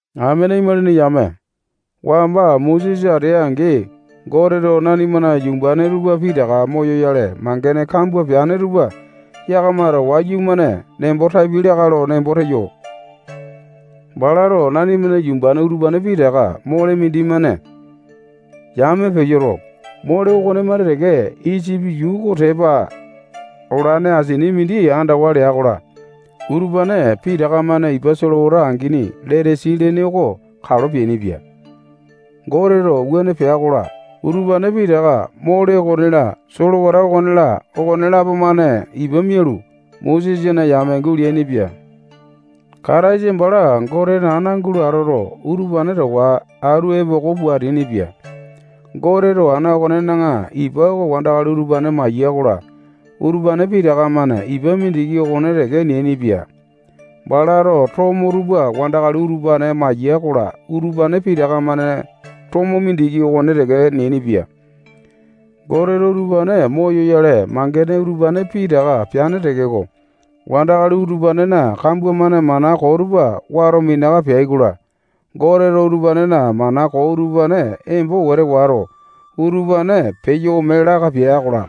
Amene imalini yame, wamba Mosesa atea-angi, Goteto nanimana yumbane tupa pitaka moyoyale mangene kambua peane tupa yakamato wayumane nembo tapiai lakae lo nembo teyo. Balato nanimana yumbane utupane pitaka mole mindimane yame peyoto, mole okonemane teke Isipi yuu oko tepa olane asini mindi andawa lea-kola, utupane pitaka-mane ipa solewata angini Letasi lene oko kalo peainipia. Goteto wuane pea-kola, utupane pitaka mole okone-la, solewata okone-la, okonelapo-mane ipa mialu, Mosesana yame guleainipia. Kataisa bala Gotena ana oko gulo atoto, utupane towa atu epoko pua ateainipia. Goteto ana okonena ipa oko wandakali utupane maiya-kola, utupane pitaka-mane ipa mindiki okone teke neainipia. Balato tomo tupa wandakali utupane maiya-kola, utupane pitaka-mane tomo mindiki okone teke neainipia. Goteto utupane moyoyale, mangene utupane pitaka peane tekeko, wandakali utupanena kambua-mane mana koo tupa wato minaka peai-kola, Goteto utupanena mana koo utupane embo wete wato, utupane peyo ome laka pea-kola,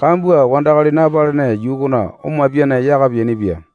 kambua wandakali napalene yuu okona omapiane yaka peainipia.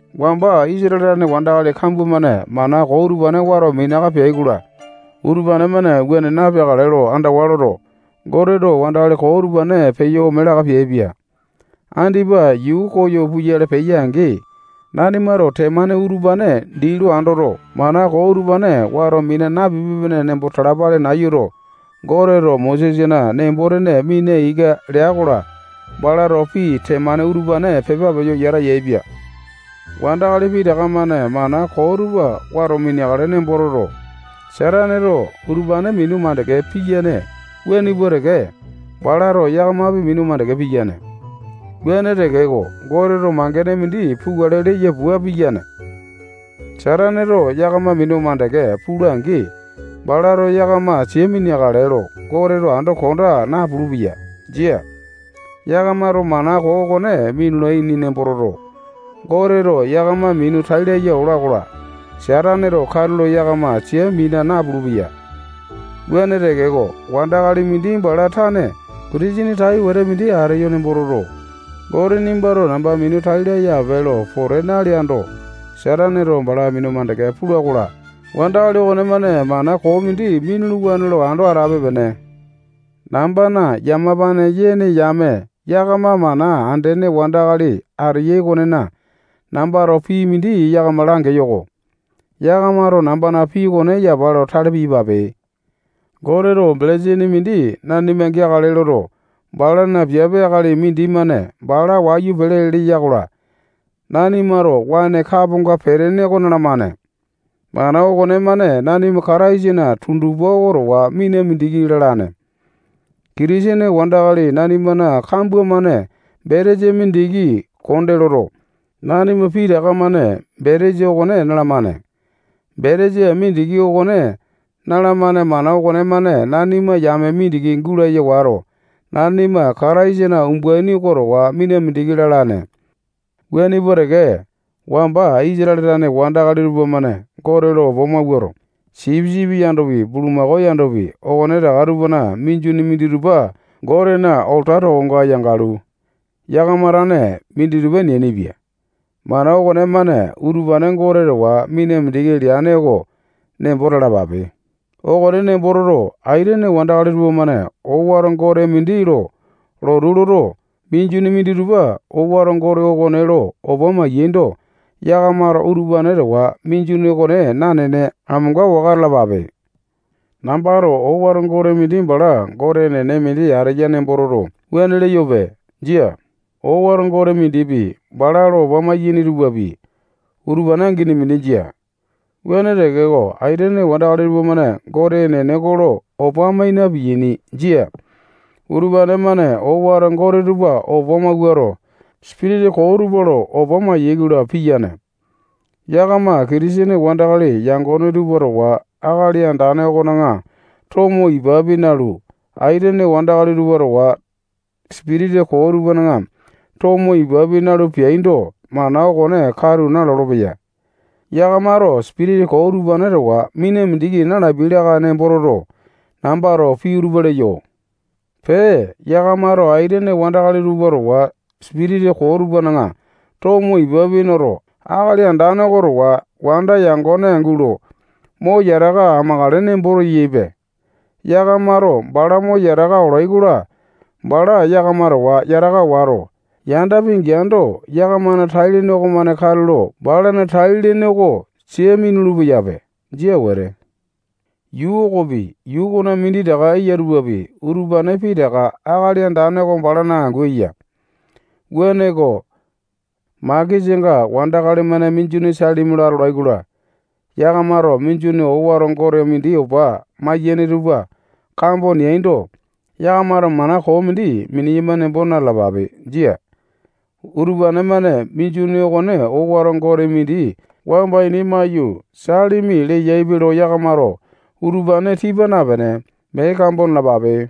Wamba Isatale tane wandakali kambua-mane mana koo utupane wato minaka peai-kola, utupane-mane wuane napeakale lo andawa loto, Goteto wandakali koo utupane peyo ome laka peaipia. Andipa yuu koyo puyale peya-angi, nanimato temane utupane dii lo andoto, mana koo utupane wato mina napipe-pene nembo talapale nayuto, Goteto Mosesana nembo-tene mina ika lea-kola, balato pii temane utupane pepa peyo yata yaepia. Wandakali pitaka-mane mana koo tupa wato mineakale nembo toto, Sataneto utupane minu mandeke piyane wuane pua teke, balato yakamapi minu mandeke piyane. Wuane tekeko, Goteto mangene mindi pukale leya pua piyane. Sataneto yakama minu mandeke pula-angi, balato yakama sia mineakale lo Goteto ando konda napulu-peya. Jia. Yakamato mana koo okone minulaini nembo toto, Goteto yakama minu tai laya ola-kola, Sataneto katulo yakama sia mina napulu-peya. Wuane tekeko, wandakali mindi bala tane Kitisene tai wete mindi ateyo nembo toto, Gote nimbato namba minu tai laya ape lo pote naleando, Sataneto bala minu mandeke pula-kola, wandakali okonemane mana koo mindi minuluwane lo ando atape-pene. Nambana yamapane yene yame yakama mana andene wandakali ateyai okonena, nambato pii mindi yakama langeyo-ko. Yakamato nambana pii okone yapa lo tale piyapape. Goteto belesini mindi nanima geakale loto, balana piape akali mindimane bala wayu pele leya-kola, nanimato waene kaponga petene oko nalamane. Mana okonemane nanima Kataisana tundupa oko towa mina mindiki lalane. Kitisene wandakali nanimana kambua-mane betesa mindiki konde loto, nanima pitaka-mane betesa okone nalamane. Betesa mindiki okone nalamane mana okonemane nanima yame mindiki gulaya wato, nanima Kataisana umbaini oko towa mina mindiki lalane. Wuane pua teke, wamba Isatale tane wandakali tupamane Gote lo opa mawuato, sipisipi yandopi, bulumako yandopi, okonetaka tupana minjuni minditupa Gotena olata tokonga yangalu, yakama tane minditupa neainipia. Mana okonemane utupane Gote towa mina mindiki leane oko nembo talapape. Okone nembo toto, aitene wandakali tupamane owato gote mindi lo lotu loto, minjuni minditupa owato gote okone lo opa mai-yaindo, yakamato utupane towa minjuni okone nanene, amonga waka atalapape. Nambato owato gote mindi bala gote enene mindi ateya nembo toto, wuane leyope. Jia. Owato gote mindipi, bala lo opa maiyene tupapi, utupane angini mindi jia. Wuane tekeko, aitene wandakali tupamane Gote enene oko lo opa mai na-piyaini. Jia. Utupane-mane owato gote tupa opa mawuato, sipitisa koo tupa lo opa maiyai-kola, piyane. Yakama Kitisene wandakali yangone tupa towa Akali Andane okona tomo ipapi nalu, aitene wandakali tupa towa sipitisa koo tupana tomo ipapi nalu peaindo, mana okone katu nalolo-peya. Yakamato sipitisa koo utupane towa mina mindiki na-lapiai lakae lo nembo toto, nambato pii utupa leyo. Pee, yakamato aitene wandakali tupa towa sipitisa koo tupana tomo ipapi noto, Akali Andane oko towa wanda yangone gulo mo yataka amakale nembo teyaipe. Yakamato bala mo yataka olai-kola, bala yakama towa yataka wato, yanda pingeando, yakamana tai-lene okomane katulo balana tai-lene oko sia minulu-peyape. Jia wete. Yuu okopi, yuu okona minditaka eya tupapi, utupane pitaka Akali Andane oko balana angu eya. Wuaneko, makesanga wandakali-mane minjuni salimi lo atolai-kola, yakamato minjuni owato gote mindi opa maiyene tupa kambo neaindo, yakamato mana koo mindi mineyama nembo na-talapape. Jia. Utupane-mane minjuni okone owato gote mindi wamba ini maiyu, salimi leyaipe lo yakamato utupane tipa napene, mee kambo nalapape.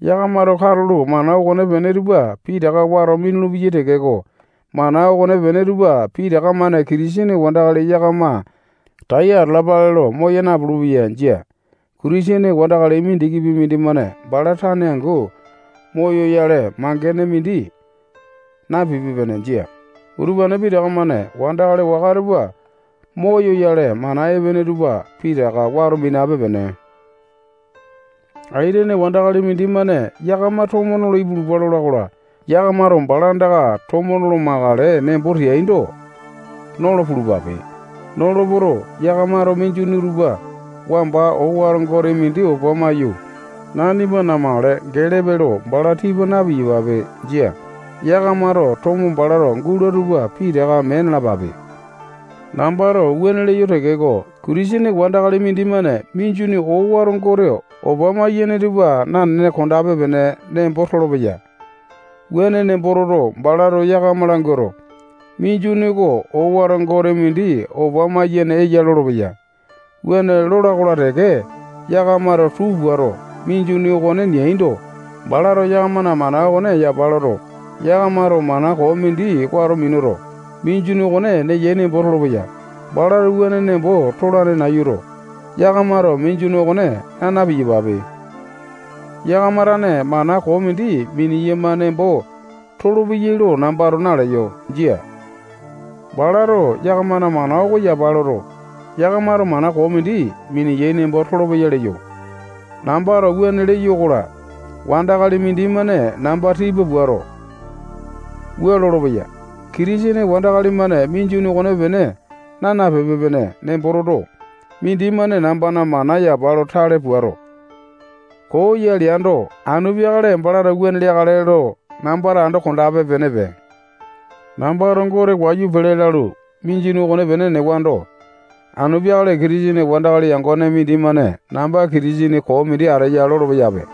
Yakamato katulo mana okonepene tupa pitaka wato minulu-peyai tekeko, mana okonepene tupa pitaka-mane Kitisene wandakali yakama tai atalapale lo moya napulu-peya. Jia. Kitisene wandakali mindikipi mindimane bala tane angu moyoyale mangene mindi napipe-pene Jia. Utupane pitaka-mane wandakali waka tupa moyoyale mana epene tupa pitaka wato minape-pene. Aitene wandakali mindimane yakama tomo nolo ipulupa lola-kola, yakamato bala andaka tomo nolo makale nembo teaindo, nolo pulupape. Nolo poto, yakamato minjuni utupa wamba owato gote mindi opa maiyu, nanima namakale gelepe lo bala tipa na-piyapape. Jia. Yakamato tomo balato gula tupa pitaka mee nalapape. Nambato wuane leyo tekeko, Kitisene wandakali mindimane minjuni owato gote opa maiyene tupa nanene kondape-pene nembo tolopeya. Wuane nembo toto, balato yakama languato, minjuni oko owato gote mindi opa maiyene eya lolopeya. Wuane lola-kola teke, yakamato tuu puato, minjuni okone neaindo, balato yakamana mana okone yapa loto, yakamato mana koo mindi wato minuto, minjuni okone neyai nembo tolopeya. Balato wuane nembo tolane nayuto, yakamato minjuni okone naa na-piyapape. Yakama tane mana koo mindi mineyama nembo tolopeyai lo nambato naleyo. Jia. Balato yakamana mana oko yapa loto, yakamato mana koo mindi mineyai nembo tolopeya leyo. Nambato wuane leyo-kola, wandakali mindimane namba tipa puato, wua lolopeya: Kitisene wandakali-mane minjuni okonepene naa nape-pene nembo toto, mindimane nambana mana yapa lo tale puato, koo ya leando, anu peakale balato wuane leakale lo nambato ando kondape-penepe. Nambato Gote wayu pele lalu, minjuni okonepene newando, anu peakale Kitisene wandakali yangone mindimane namba Kitisene koo mindi ateya lolo-peyape.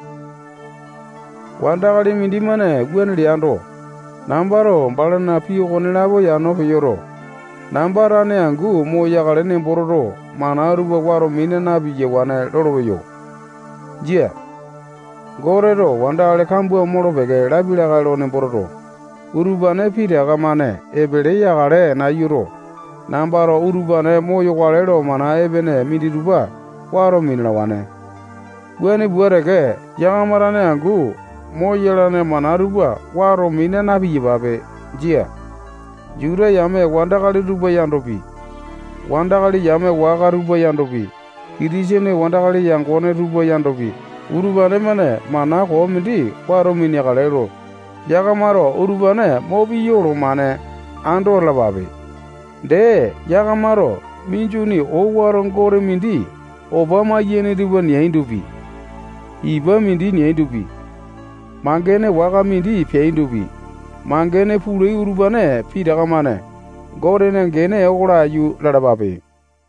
Wandakali mindimane wuane leando, nambato balana pii okonelapo yano peyoto, namba tane angu moyakale nembo toto, mana tupa wato mina na-piyawane lolopeyo. Jia. Goteto wandakali kambua molo-peke lapia lakae lo nembo toto, utupane pitaka-mane epele yakale nayuto, nambato utupane moyokale lo mana epene minditupa wato minalawane. Wuane pua teke, yakama tane angu moyolane mana tupa wato mina na-piyapape. Jia. Juta yame wandakali tupa yandopi, wandakali yame waka tupa yandopi, Kitisene wandakali yangone tupa yandopi, utupane-mane mana koo mindi wato mineakale lo yakamato utupane mo piya olomane ando atalapape. Dee, yakamato minjuni owato gote mindi opa maiyene tupa neaindopi, ipa mindi neaindopi, mangene waka mindi peaindopi, mangene pulai utupane pitaka-mane Gotena gene oko laiyu lalapape.